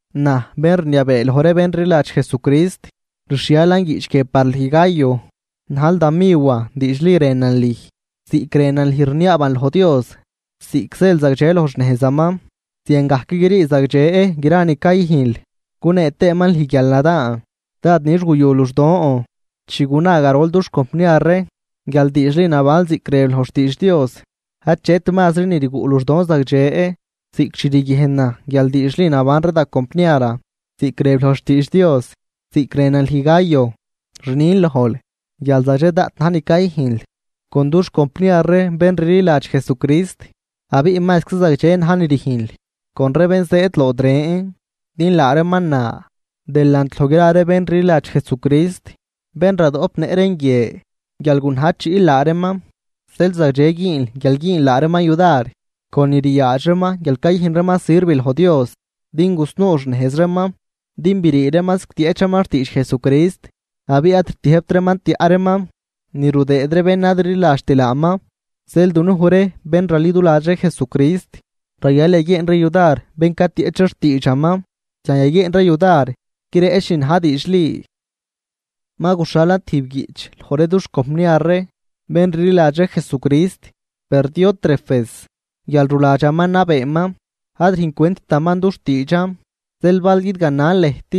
Naj, bén rniabee loj ree bén rliladx Jesucrist, rxhialan guiꞌch guie par lüj Gayo najl da miwan diidxli rënan lüj. Ziꞌc rënan lüj rniaaban loj Dios ziꞌc zël zagdxe loj xnejzaman ziangajc grii zagdxe gra ni cayüjnl gunee tëëman lüj guialnadaan. Dád nix guyu luxdon chi guna garol dux compniar ree guial diidxli nabanl ziꞌc rëb loj xtiidx Dios. Achet mazri ni rguꞌ luxdon zagdxe ziꞌc chi riguiejnan guial diidxli naban ree da compniaran ziꞌc rëb loj xtiidx Dios. Ziꞌc rënan lüj Gayo, rnin lojl guial zagdxe daꞌt na̱j ni cayüjnl con dux compniar ree bén rliladx Jesucrist abiꞌ mazczi zagdxe na̱j ni rüjnl con ree bén zëëd lood ren. Din laa reeman na delant loj gra ree bén rliladx Jesucrist, bén radoꞌpnëꞌ reen guie, guial gunajchiꞌl laa reeman, zeel zagdxe güünl guial güünl laa reeman yudar con ni ryaadx reeman guial cayüjn reeman sirv loj Dios din gusnuu xnejz reeman. Din brii reeman zigtieꞌch reeman xtiidx Jesucrist abiꞌ ad rtiëjbt reeman tiaꞌ reeman ni rudëë ree bén ad rliladxt laaman. Zeel dunuj ree bén raliduladx ree Jesucrist, rayal yaguieen ree yudar bén catieꞌch ree xtiidxaman, zian yaguieen ree yudar guireꞌch ni na̱j diidxli. Ma guxhalan tijb guiꞌch loj ree dux compniar ree bén rliladx ree Jesucrist, per Diótrefes guial ruladxaman nabeeman ad rüjncwenttaman dux tiidxan. Zeel bal guidganan lëjt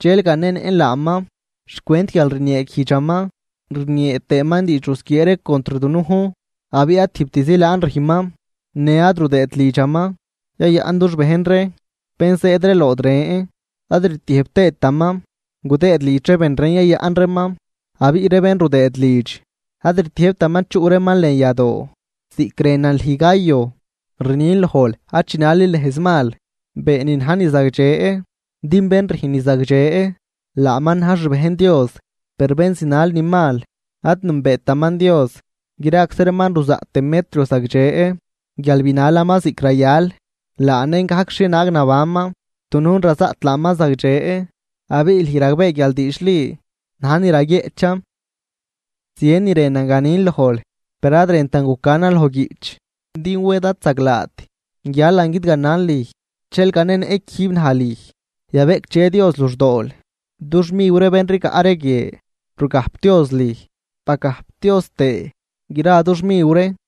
dxel ganenëꞌn laaman xcwent guial rnieeguijdxaman rniee tëëman diidx rusquiee contr dunujn abiꞌ ad tijbtzi laan rüjnman në ad rudëët lidxaman yayaꞌn dux bejn ree bén zëëd ree lood ren, ad rtiëjb tëëtaman gudëëd lidx ree ben ren yayaꞌn reeman, abiꞌ ree bén rudëëd lidx ad rtiëjbtaman chuꞌ reeman lën yadoo. Ziꞌc rënan lüj Gayo rnin lojl ad chinalil nejz mal, been ni na̱j ni zagdxe din bén rüjn ni zagdxe laaman na̱j xbejn Dios per bén zinal ni mal ad nünbeetaman Dios. Graczi reeman ruzaꞌt Demetrio zagdxe guial binalaman ziꞌc rayal, laa nen gajc xhienaag nabanman xt dunujn razaꞌt laaman zagdxe abiꞌ lüj ragbee guial diidxli naj ni raguieꞌchan. Zien ni rënan ganin lojl per ad rëntan gucanan loj guiꞌch, din wed ad zaglaat guialan guidganan lüj, dxel ganenëꞌ quijb naj lüj. Yabeꞌcdxe Dios luxdool, dux miw ree bén rigaꞌ ree guie rugajpdioz lüj, bagajpdioz tëë gra dux miw ree.